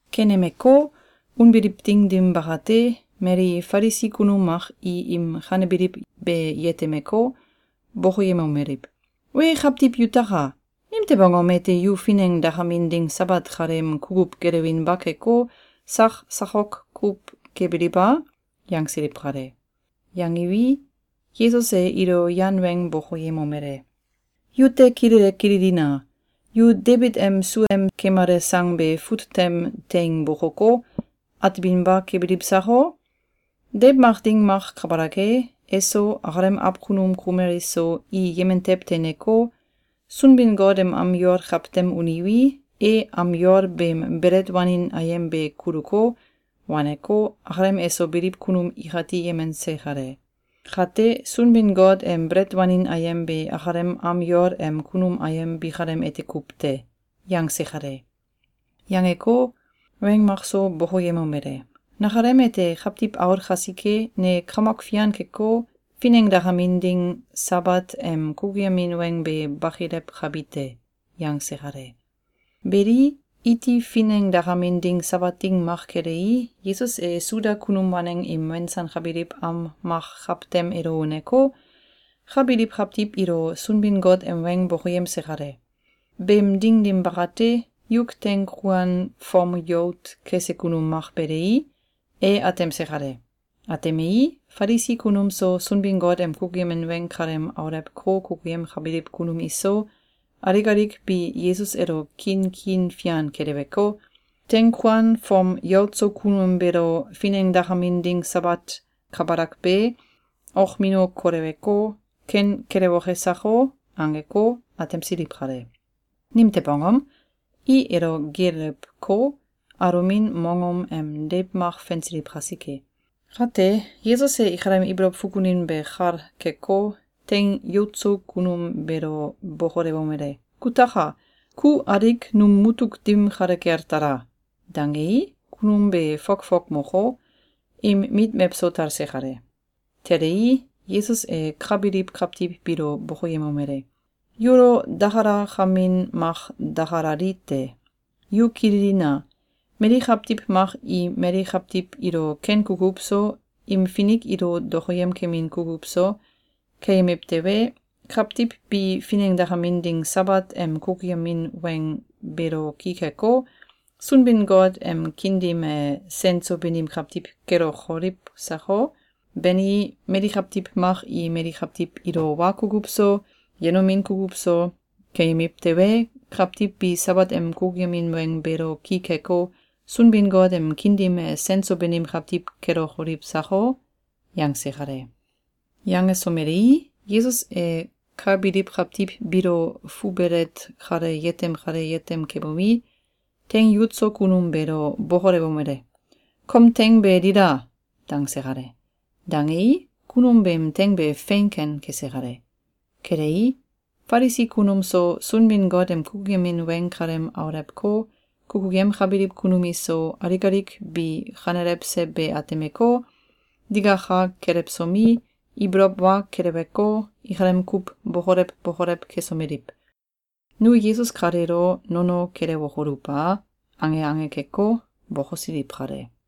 Kenemeko, unbiliw ding dim bakate, mali Falisi kunum mak i im kanebiliw be yetemeko, bokoyemomeliw: “Wee kawtiw yutaka! Nimtew angom ete yu finengdakamin ding Sabat kaleem kukuw gelewinba keko, sak sakok kuw kebiliw a?”, yangsiliw kale. Yangiwi, Yesus e ilo yan weng bokoyemomele: “Yute kilele kililina! Yu Debit em sua em kemale sang be fut tem teing bokoko, ateminba kebiliw sako? Deiw mak ding mak kabalak e, eso, akalem awkunum kumel iso, i yemen tew teineko, Sunbin-Got em am yol kawtem uniwi, e am yol beem belet wanin ayem be kuluko, waneko, akalem eso biliw kunum ikati yemense kale. Kate, Sunbin-Got em belet wanin ayem be akalem am yol em kunum ayem bikalem ete kuw te.”, yangse kale. Yangeko, weng makso bokoyemomele: “Nakalem ete Kawtiw Aul kasike, ne kamok fian keko, finengdakamin ding Sabat em kukuyemin weng be bakilewkabi te.”, yangse kale. Beli, iti finengdakamin ding Sabat ding mak kelei, Yesus e Suda kunum waneng im wensankabiliw am mak kawtem elo uneko, ka biliw kawtiw ilo Sunbin-Got em weng bokoyemse kale. Beem ding dim bakate, yuk teing kuan fom yout kese kunum mak belei, e atemse kale. Atemei, Falisi kunum so, Sunbin-Got em kukuyemin weng kalem aulewko, kukuyemkabiliw kunum iso, alik alik bi Yesus elo kiin kiin fian keleweko, “Teing kuan fom yout so kunum beelo finengdakamin ding Sabat kabalak be, okmino koleweko, ken kelewoke sako?”, angeko, atemsiliw kale. Nimtew angom? I elo geelewko, alomin mongom em deiw mak fensiliw kasike. Kate, Yesus e ikalem ibolow fukunin be kal keko, teing yout so kunum beelo bokolewomele: “Kutaka! Ku alik num mutuk dim kale kel tala!”, dangei, kunum be fokfok moko, im mit mewso talse kale. Telei, Yesus e ka biliw kawtiw biilo bokoyemomele: “Yulo dakalakamin mak dakalali te! Yu kililina! Mali kawtiw mak i mali kawtiw ilo ken kukuw so, im finik ilo dokoyemkemin kukuw so, keyemiw tewe, kawtiw bi finengdakamin ding Sabat em kukuyemin weng beelo ki keko, Sunbin-Got em kiin dim e sen so banim kawtiw kelokoliw sako? Bani, mali kawtiw mak i mali kawtiw ilo wa kukuw so, yenomin kukuw so, keyemiw tewe, kawtiw bi Sabat em kukuyemin weng beelo ki keko, Sunbin-Got em kiin dim e sen so banim kawtiw kelokoliw sako?”, yangse kale. Yangesomelei, Yesus e ka biliw kawtiw biilo fubelet kale yetem kale yetem kebomi, teing yout so kunum beelo bokolewomele: “Kom teing be dila!”, dangse kale. Dangei, kunum beem teing be fein ken kese kale. Kelei, Falisi kunum so, Sunbin-Got em kukuyemin weng kalem aulewko, kukuyemkabiliw kunum iso, alik alik bi kanelewse be atemeko, digaka kelewsomi, ibolow wa keleweko, ikalem kuw bokolew bokolew kesomeliw: “Nu Yesus kaleelo nono kelewokoluw a?”, ange ange keko, bokosiliw kale.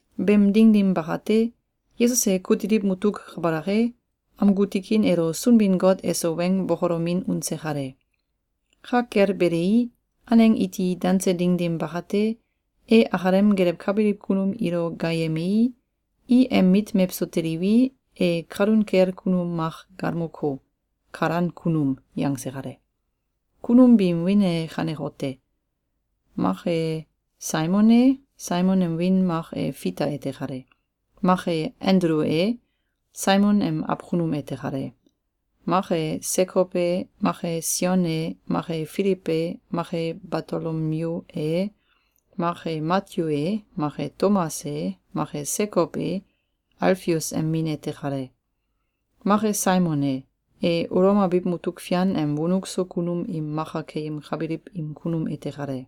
Beem ding dim bakate, Yesus e kutiliw mutuk kabalak e, amgu tikin elo Sunbin-Got eso weng bokolomin unse kale. Ka kel belei, aneng iti danse ding dim bakate, e akalem gelewkabiliw kunum ilo gaayemei, i em mit mewso teliwi, e kalun kel kunum mak galmoko, “Kalan Kunum” yangse kale. Kunum biim wiin e kanekote: Mak e Saimon e — Saimon em wiin mak e Fita ete kale. Mak e Andulu e — Saimon em awkunum ete kale. Make Sekow e, mak e Sion e, mak e Filiw e, mak e Batolomyu e, mak e Matyu e, mak e Tomas e, mak e Sekow e — Alfius em min ete kale. Mak e Saimon e — E Ulom abiw mutuk fian em wonuk so kunum im maka keyemkabiliw im kunum ete kale.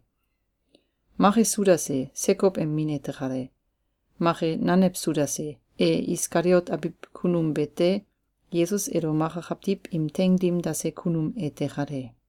Mak e Sudas e — Sekow em min ete kale. Mak e nanew Sudas e — E Iskaliot abiw kunum bete, Yesus elo maka kawtiw im teing dim dase kunum ete kale.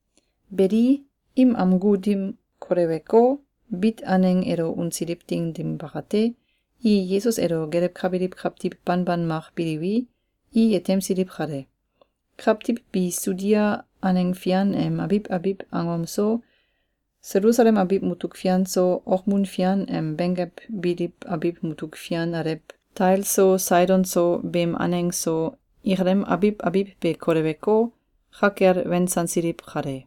Beli, im amgu dim koleweko, bit aneng elo unsiliw ding dim bakate, i Yesus elo gelewkabiliw kawtiw banban mak biliwi, i yetemsiliw kale. Kawtiw bi Sudia aneng fian em abiw abiw angom so, Selusalem abiw mutuk fian so, okmun fian em benggew biliw abiw mutuk fian alew Tail so Saidon so beem aneng so, ikalem abiw abiw be koleweko, ka kel wensansiliw kale.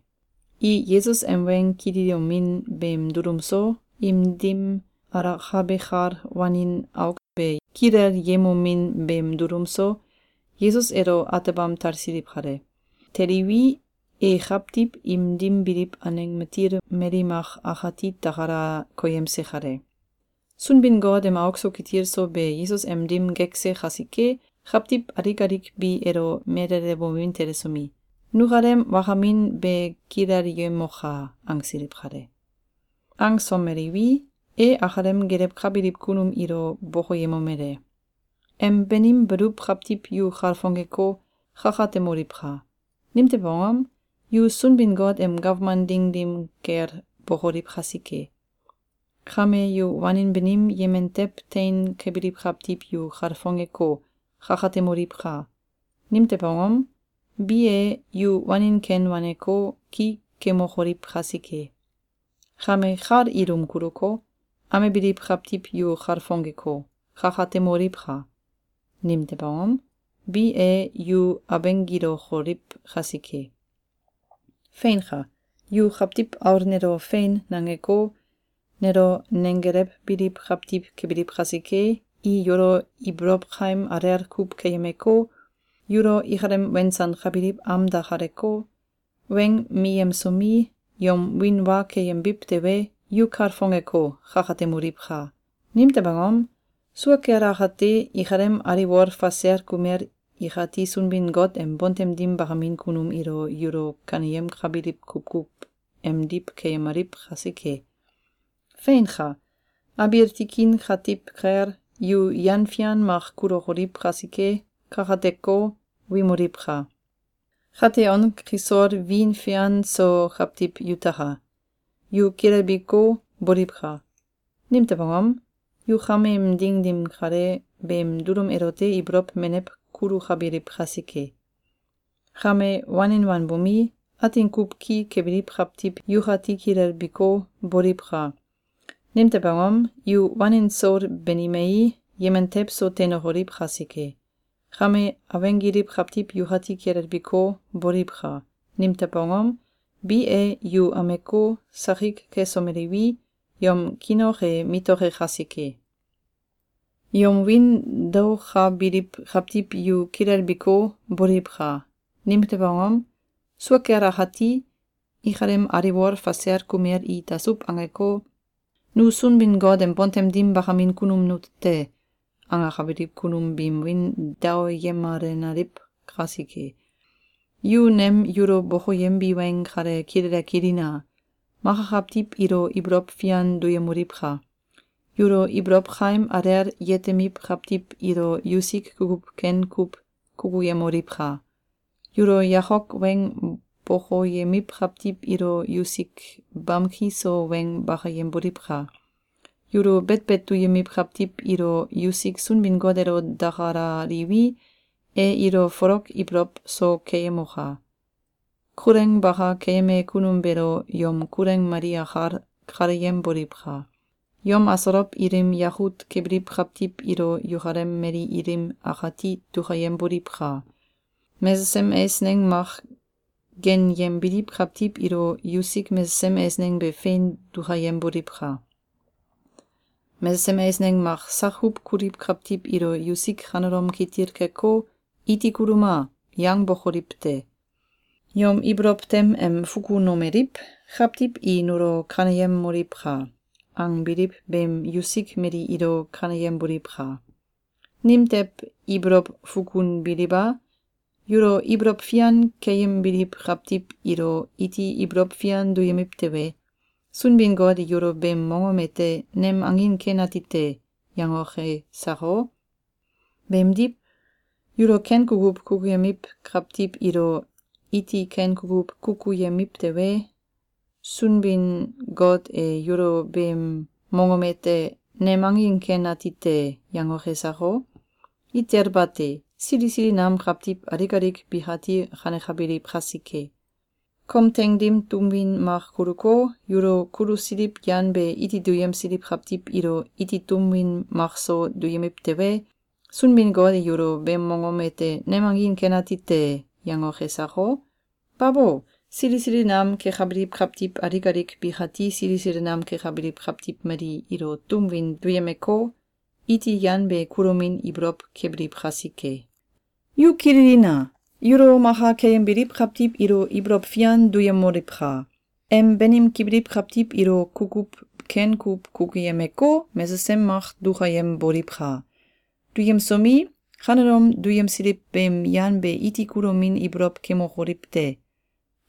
I Yesus em weng kililomin beem dulum so, im dim alakabe kal wanin auk be kilelyemomin beem dulum so, Yesus elo atebam talsiliw kale. Teliwi, e kawtiw im dim biliw aneng matil mali mak akati takala koyemse kale. Sunbin-Got em auk so kitil so be Yesus em dim gekse kasike, kawtiw alik alik bi elo melelewomin telesomi, “Nukalem wakamin be kilelyemoka!”, angsiliw kale. Angsomeliwi, e akalem gelewkabiliw kunum ilo bokoyemomele: “Em banim baluw kawtiw yu kalfongeko, kakatemoliwka! Nimtew angom? Yu Sunbin-Got em gawman ding dim kel bokoliw kasike. Kame yu wanin banim yemen tew tein kebiliw kawtiw yu kalfongeko, kakatemoliwka! Nimtew angom? Bi e, yu wanin ken waneko, ki kemokoliw kasike. Kame kal ilum kuluko, amebiliw kawtiw yu kalfongeko, kakatemoliwka! Nimtew angom? Bi e, yu abenggilokoliw kasike. Feinka! Yu Kawtiw Aul nelo, ‘Fein!’, nangeko, nelo nenggelewbiliw kawtiw kebiliw kasike, i yulo ibolow kaim alel kuw keyemeko, yulo ikalem wensankabiliw am dakaleko, weng miyemsomi, yom wiin wa keyembiw tewe, yu kalfongeko, kakatemoliwka! Nimtew angom? Sua kel akate, ikalem aliwol fasel kumel ikati Sunbin-Got em bontem dim bakamin kunum ilo yulo kaneyemkabiliw kukuw emdiw keyemaliw kasike. Feinka! Abiil tikin katiw kel, yu yan fian mak kulukoliw kasike, kakateko, wimoliwka! Kate on kisol wiin fian so kawtiw yutaka! Yu kilelbiko, boliwka! Nimtew angom? Yu kameem ding dim kale, beem dulum elote ibolow menew kulukabiliw kasike. Kame wanin wanbomi, atin kuw ki kebiliw kawtiw yukati kilelbiko, boliwka! Nimtew angom? Yu wanin soul banimei, yemen tew so teinokoliw kasike. Kame abenggiliw kawtiw yukati kilelbiko, boliwka! Nimtew angom? Bi e, yu ameko, sakik kesomeliwi, yom kiin ok e mitoke kasike. Yom wiin daokabiliw kawtiw yu kilelbiko, boliwka! Nimtew angom? Sua kel akati, ikalem aliwol fasel kumel i dasuw angeko, ‘Nu Sunbin-Got em bontem dim bakamin kunum nute te!’, angakabiliw kunum biim wiin daoyemalenaliw kasike. Yu nem yulo bokoyembi weng kale kilele kililina! Maka kawtiw ilo ibolow fian duyemoliwka! Yulo ibolow kaim alel yetemiw kawtiw ilo yusik kukuw ken kuw kukuyemoliwka! Yulo yakok weng bokoyemiw kawtiw ilo yusik bamki so weng bakayemboliwka! Yulo betbet duyemiw kawtiw ilo yusik Sunbin-Got elo dakalaliwi, e ilo folok ibolow so keyemoka! Kuleng baka keyeme kunum beelo yom kuleng mali akal kaleyemboliwka! Yom asolow ilim yakut kebiliw kawtiw ilo yukalem mali ilim akati dukayemboliwka! Mesesem eisneng mak genyembiliw kawtiw ilo yusik mesesem eisneng be fein dukayemboliwka! Mesesem eisneng mak sak kuw kuliw kawtiw ilo yusik kanelom kitil keko, ‘Iti kuluma!’, yangbokoliw te. Yom ibolow tem em fukunomeliw: ‘Kawtiw i nulo kaneyemoliwka!’, angbiliw beemdiw yusik mali ilo kaneyemboliwka! Nimtew ibolow fununbiliw a? Yulo ibolow fian keyembiliw kawtiw ilo iti ibolow fian duyemiw tewe, Sunbin-Got e yulo beem mongom ete ‘Nem angin ken ati te!’, yangoke sako? Beemdiw, yulo ken kukuw kukuyemiw kawtiw ilo iti ken kukuw kukuyemiw tewe, Sunbin-Got e yulo beem mongom ete ‘Nem angin ken ati te!’, yangoke sako? Itel bate! Sili sili nam kawtiw alik alik bikati kanekabiliw kasike. Kom teing dim tum win mak kuluko, yulo kulusiliw yan be iti duyemsiliw kawtiw ilo iti tum win makso duyemiw tewe, Sunbin-Got e yulo beem mongom ete ‘Nem angin ken ati te!’, yangoke sako? Babo! Sili sili nam kekabiliw kawtiw alik alik bikati sili sili nam kekabiliw kawtiw mali ilo tum win duyemeko, iti yan be kulomin ibolow kebiliw kasike. Yu kililina! Yulo maka keyembiliw kawtiw ilo ibolow fian duyemoliwka! Em banim kebiliw kawtiw ilo kukuw ken kuw kukuyemeko, mesesem mak dukayemboliwka! Duyemsomi, kanelom duyemsiliw beem yan be iti kulomin ibolow kemokoliw te!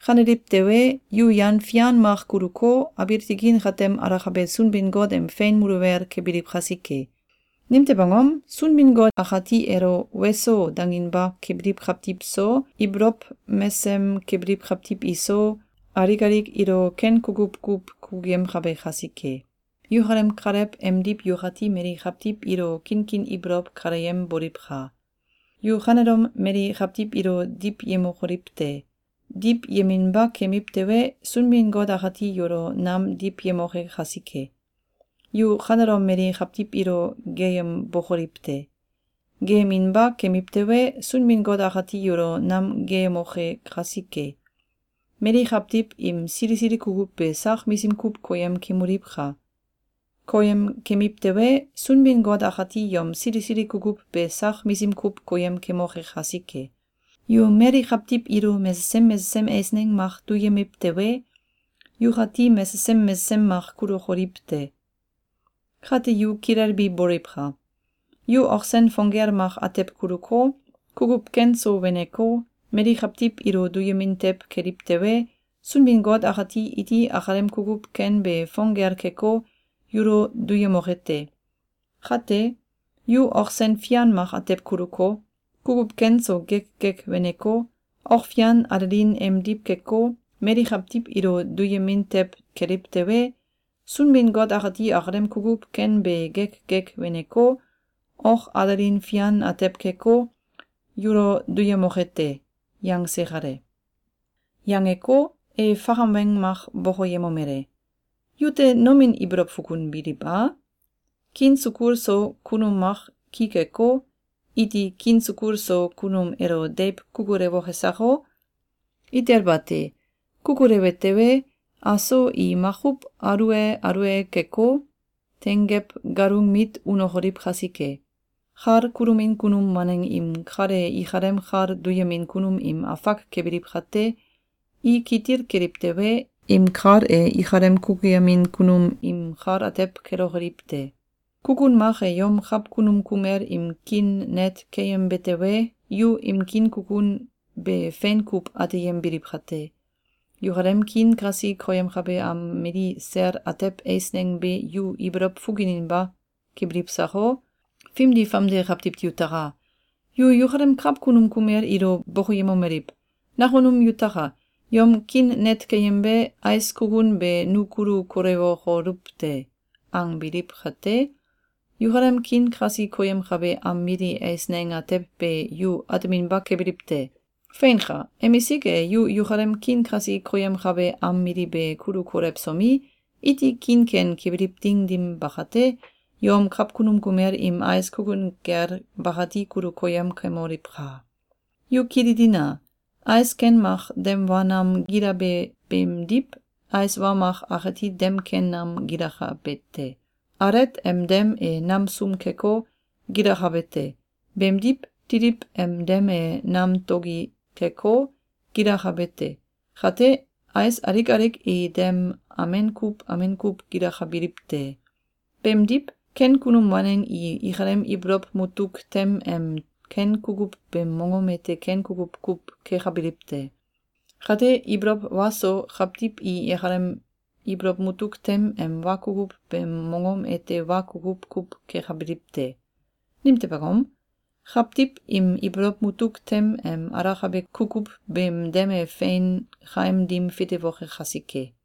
Kaneliw tewe, yu yan fian mak kuluko, abiil tikin katem alakabe Sunbin-Got em fein muluwel kebiliw kasike. Nimtew angom? Sunbin-Got akati elo ‘Weso!’, danginba kebiliw kawtiw so, ibolow mesem kebiliw kawtiw iso, alik alik ilo ken kukuw kuw kukuyemkabe kasike. Yukalem Kalew emdiw yukati mali kawtiw ilo kinkin ibolow kaleyemboliwka! Yu kanelom mali kawtiw ilo diwyemokoliw te! Diwyeminba kemiw tewe, Sunbin-Got akati yulo nam diwyemoke kasike. Yu kanelom mali kawtiw ilo geeyembokoliw te! Geeyeminba kemiw tewe, Sunbin-Got akati yulo nam geeyemoke kasike. Mali kawtiw im sili sili kukuw be sak misim kuw koyem kemoliwka! Koyem kemiw tewe, Sunbin-Got akati yom sili sili kukuw be sak misim kuw koyem kemoke kasike. Yu mali kawtiw ilo mesesem mesesem eisneng mak duyemiw tewe, yukati mesesem mesesem mak kulokoliw te. Kate yu kilelbi boliwka! Yu ok sen fong gel mak atew kuluko, kukuw ken so weneko, mali kawtiw ilo duyemin tew keliw tewe, Sunbin-Got akati iti akalem kukuw ken be fong gel keko, yulo duyemoke te. Kate, yu ok sen fian mak atew kuluko, kukuw ken so gek gek weneko, ok fian alelin emdiw keko, mali kawtiw ilo duyemin tew keliw tewe, Sunbin-Got akati akalem kukuw ken be gek gek weneko, ok alelin fian atew keko, yulo duyemoke te.”, yangse kale. Yangeko, e fakam weng mak bokoyemomele: “Yute nomin ibolow fukunbiliw a? Kiin sukul so kunum mak ki keko, iti kiin sukul so kunum elo deiw kukulewoke sako? Itel bate! Kukulewe tewe, aso i makuw alue alue keko, tenggew galung mit unokoliw kasike! Kal kulomin kunum waneng im kal e ikalem kal duyemin kunum im afak kebiliw kate, i kitil keliw tewe, im kal e ikalem kukuyemin kunum im kal atew kelokoliw te. Kukun mak e yom kawkunum kumel im kiin net keyembe tewe, yu im kiin kukun be fein kuw ateyembiliw kate, yukalem kiin kasi koyemkabe am mili sel atew eisneng be yu ibolow fukuninba kebiliw sako? Fimdi fomde kawtiw yutaka! Yu yukalem kawkunum kumel ilo bokoyemomeliw: “Nakunum yutaka! Yom kiin net keyembe ais kukun be nu kulu kolewokoluw te!”, angbiliw kate, yukalem kiin kasi koyemkabe am mili eisneng atew be yu ateminba kebiliw te! Feinka! Emisik e yu yukalem kiin kasi koyemkabe am mili be kulu kolewsomi, iti kiin ken kebiliw ding dim bakate, yom kawkunum kumel im ais kukun gel bakati kulu koyem kemoliwka! Yu kililina! Ais ken mak dem wa nam gilabe beemdiw, ais wa mak akati dem ken nam gilakabe te. Alet em dem e nam sum keko, gilakabe te. Beemdiw, titiw em dem e nam togi keko, gilakabe te. Kate, ais alik alik i dem amen kuw amen kuw gilakabiliw te. Beemdiw, ken kunum waneng i ikalem ibolow mutuk tem em ken kukuw beem mongom ete ken kukuw kuw kekabiliw te. Kate, ibolow wa so kawtiw i ikalem ibolow mutuk tem em wa kukuw beem mongom ete wa kukuw kuw kekabiliw te. Nimtew angom? Kawtiw im ibolow mutuk tem em alakabe kukuw beem dem e fein kaim dim fitewoke kasike.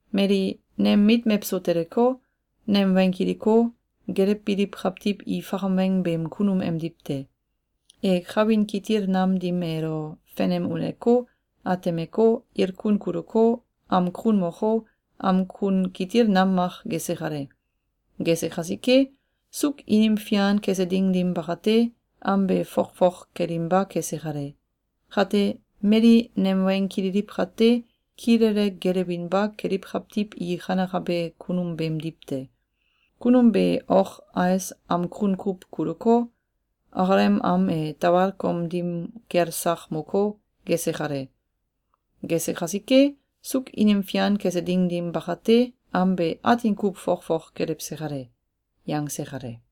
Mali nem mit mewso teleko, nem weng kiliko, gelewbiliw kawtiw i fakam weng beem kunum emdiw te. E kawin kitil nam dim elo fenem uneko, atemeko, ilkun kuluko, am kun moko, am kun kitil nam mak gese kale. Gese kasike, suuk inim fian kese ding dim bakate, am be fokfok kelinba kese kale. Kate, mali nem weng kililiw kate, kilele gelewinba keliw kawtiw i kanekabe kunum beemdiw te. Kunum be ok ais am kun kuw kuluko, akalem am e tawal kom dim kel sak moko, gese kale. Gese kasike, suuk inim fian kese ding dim bakate, am be atin kuw fokfok kelewse kale.”, yangse kale.